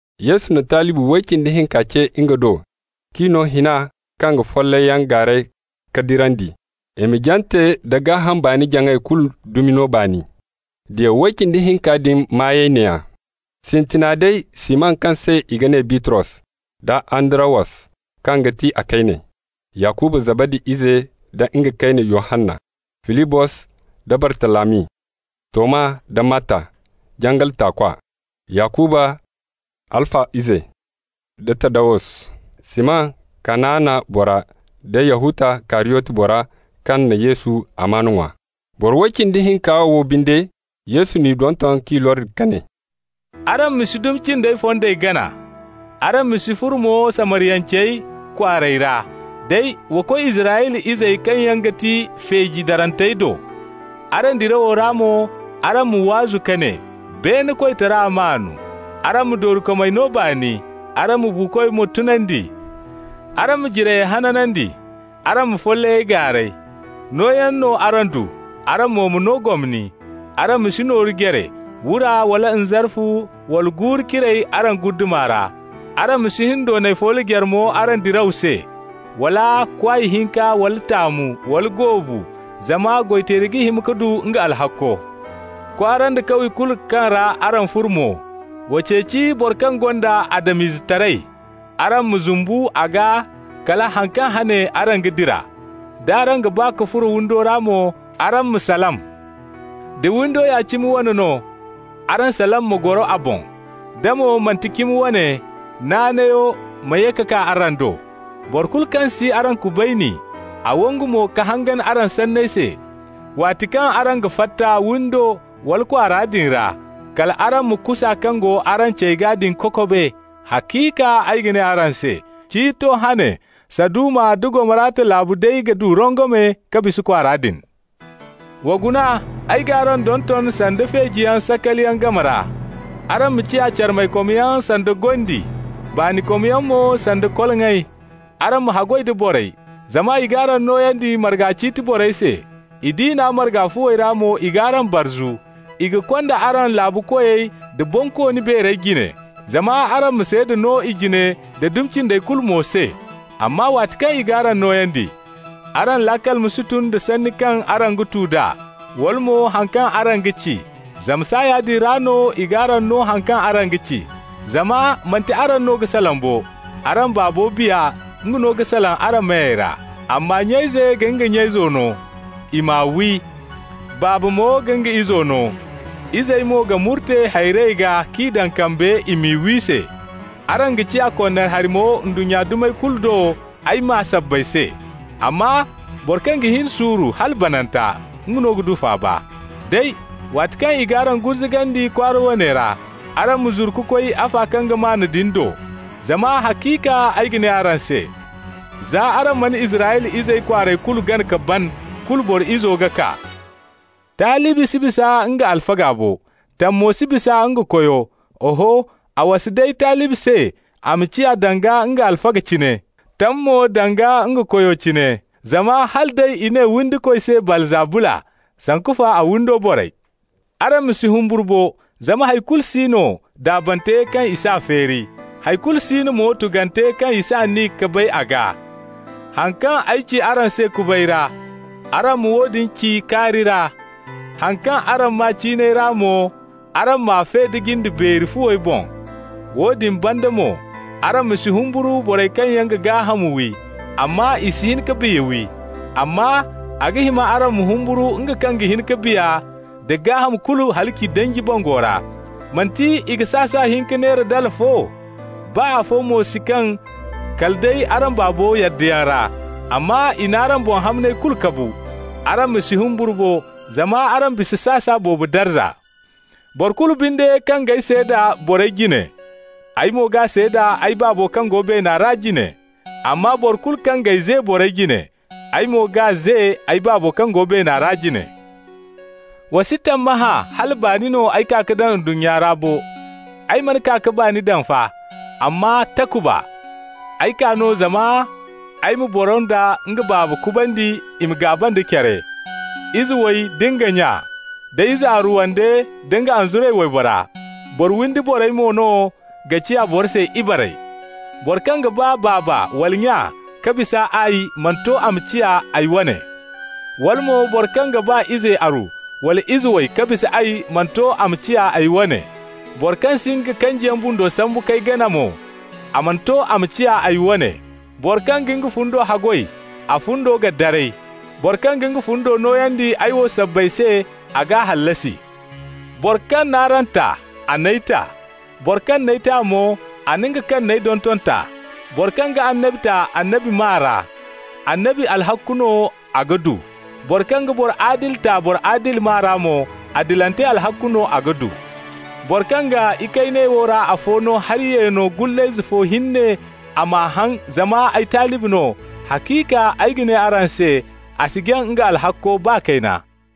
Yesu na nga talibi way cindi hinka ce nga do k'i no hina kaŋ ga follayyaŋ gaaray ka dirandi, i ma jante da gaaham baani-jaŋay kulu dumi no baani. Diya way cindi hinka din maayey neeya: sintina day Siman kaŋ se i ga ne Bitros, da Andarawos kaŋ ga ti a kayne; Yakuba Zabadi ize da nga kayne Yohanna; Filibos da Bartalami; Toma da Matta, jangal taakwa; Yakuba Halfa ize da Taddawus; Siman Kanaana bora da Yahuta Kariyoti bora, kaŋ na Yesu amaana ŋwa. Boro way cindi hinka wo binde, Yesu n'i donton k'i lordi ka ne: «Araŋ ma si dumi cindey fondey gana. Araŋ ma si furo mo Samariyancey kwaarey ra. Day wa koy Israyla izey kaŋ yaŋ ga ti feeji darantey do. Araŋ diraw ra mo, araŋ ma waazu ka ne: ‹Beene koytara maan.› Araŋ ma doorikomey no baani. Araŋ ma buukoy mo tunandi. Araŋ ma jirayey hanandi. Araŋ ma follayey gaaray. Nooyaŋ no araŋ du, araŋ mo ma no gomni. Araŋ ma si nooru jare, wura wala nzarfu wala guuru-ciray araŋ guddama ra. Araŋ ma si hindoonay foolo jare mo araŋ diraw se, wala kwaay hinka, wala taamu, wala goobu, zama goy-teeri ga hima ka du nga alhakko. Kwaara nda kawye kulu kaŋ ra araŋ furo mo, wa ceeci boro kaŋ gonda Adam-izetaray. Araŋ ma zumbu a gaa kala han kaŋ hane araŋ ga dira. D'araŋ ga ba ka furo windi ra mo, araŋ m'a salam. Da windo ya cimi wane no, araŋ salam ma goro a boŋ. Da mo manti cimi wane, naanayo ma ye ka kaa araŋ do. Boro kulu kaŋ si araŋ kubayni, a wangu mo ka hangan araŋ sanney se, waati kaŋ araŋ ga fatta windo wala kwaara din ra, kal araŋ ma kusa kaŋ go araŋ cey gaa din kokobe. Haciika ay ga ne araŋ se: Ciito hane Saduma da Gomorata laabu day ga du rongome ka bisa kwaara din. Wa guna, ay g'araŋ donton sanda feejiyaŋ sakaliyaŋ game ra. Araŋ ma ciya carmaykomyaŋ sanda gondi, baanikomyaŋ mo sanda koloŋay. Araŋ ma haggoy da borey, zama i g'araŋ nooyandi marga ciiti borey se, i diina marga fuwey ra mo i g'araŋ barzu. I ga konda araŋ laabu koyey da bonkooni beerey jine, zama araŋ ma seeda no i jine da dumi cindey kulu mo se. Amma waati kaŋ i g'araŋ nooyandi, araŋ laakal ma si tun da sanni kaŋ araŋ ga tu d'a, wala mo haŋ kaŋ araŋ ga ci. Zama saaya din ra no i g'araŋ no haŋ kaŋ araŋ ga ci. Zama manti araŋ no ga salaŋ bo. Araŋ Baabo Biya, nga no ga salaŋ araŋ meyey ra. Amma nya-ize ga nga nya-izo no i m'a wi, baaba mo ga nga izo no. Izey mo ga murte hayrey gaa k'i daŋ kambe i m'i wi se. Araŋ ga ciya konnari hari mo ndunnya dumey kulu do ay maa sabbay se. Amma boro kaŋ ga hin suuru hala bananta, nga no ga du faaba. Day, waati kaŋ i g'araŋ gurzugandi kwaara woone ra, araŋ ma zuru ka koy afa kaŋ ga maan din do. Zama haciika ay ga ne araŋ se: za araŋ mana Israyla izey kwaarey kulu gana ka ban, kulu Boro Izo ga kaa. Talibi si bisa nga alfaga bo, tam mo si bisa nga koyo. Oho, a wasa day talibi se a ma ciya danga nga alfaga cine, tam mo danga nga koyo cine. Zama hala day i ne windikoy se Baalzabula, sanku fa a windo borey! Araŋ ma si humburu bo, zama hay kulu si no daabante kaŋ i s'a feeri. Hay kulu si no mo tugante kaŋ i si aniya ka bay a gaa. Haŋ kaŋ ay ci araŋ se kubay ra, araŋ ma woodin ci kaari ra. Haŋ kaŋ araŋ maa ciinay ra mo, araŋ m'a fe da jinde beeri fuwey boŋ. Woodin banda mo, araŋ ma si humburu borey kaŋ yaŋ ga gaaham wi, amma i si hin ka biya wi. Amma a ga hima araŋ ma humburu nga kaŋ ga hin ka biya nda gaaham kulu halaci danji bango ra. Manti i ga sasa hinka neera dala fo? Baa afo mo si kaŋ kala day araŋ Baabo yaddayaŋ ra. Amma i n'araŋ boŋ hamney kulu kabu. Araŋ ma si humburu bo, zama araŋ bisa sasa boobo darza. Boro kulu binde kaŋ g'ay seeda borey jine, ay mo g'a seeda ay Baabo kaŋ go beena ra jine. Amma boro kulu kaŋ g'ay ze borey jine, ay mo g'a ze ay Baabo kaŋ go beena ra jine. Wa si tammahã hala baani no ay kaa ka daŋ ndunnya ra bo. Ay mana kaa ka baani daŋ fa, amma takuba. Ay kaa no zama ay ma ‹boro nda nga baaba kubandi i ma gaaba nda care, ize way da nga nya, da ize aru wande nda nga anzuray waybora. Boro windi borey mo no ga ciya boro se ibarey.› Boro kaŋ ga ba baaba wala nya ka bisa ay mana to a ma ciya ay wane. Wala mo, boro kaŋ ga ba ize aru wala ize way ka bisa ay mana to a ma ciya ay wane. Boro kaŋ si nga kanjiyaŋ bundo sambu k'ay gana mo, a mana to a ma ciya ay wane. Boro kaŋ ga nga fundo haggoy, a fundo ga daray. Boro kaŋ ga nga fundo nooyandi ay wo sabbay se, a g'a hallasi. Boro kaŋ n'araŋ ta, a n'ay ta. Boro kaŋ n'ay ta mo, a na nga kaŋ n'ay donton ta. Boro kaŋ ga annabi ta annabi maa ra, annabi alhakku no a ga du. Boro kaŋ ga boro adili ta boro adili maa ra mo, adilante alhakku no a ga du. Boro kaŋ ga ikayney wo ra afo no hari yeeno gullayze fo hinne a m'a haŋ zama ay talibi no, haciika ay ga ne araŋ se, a si jaŋ nga alhakko baa kayna.»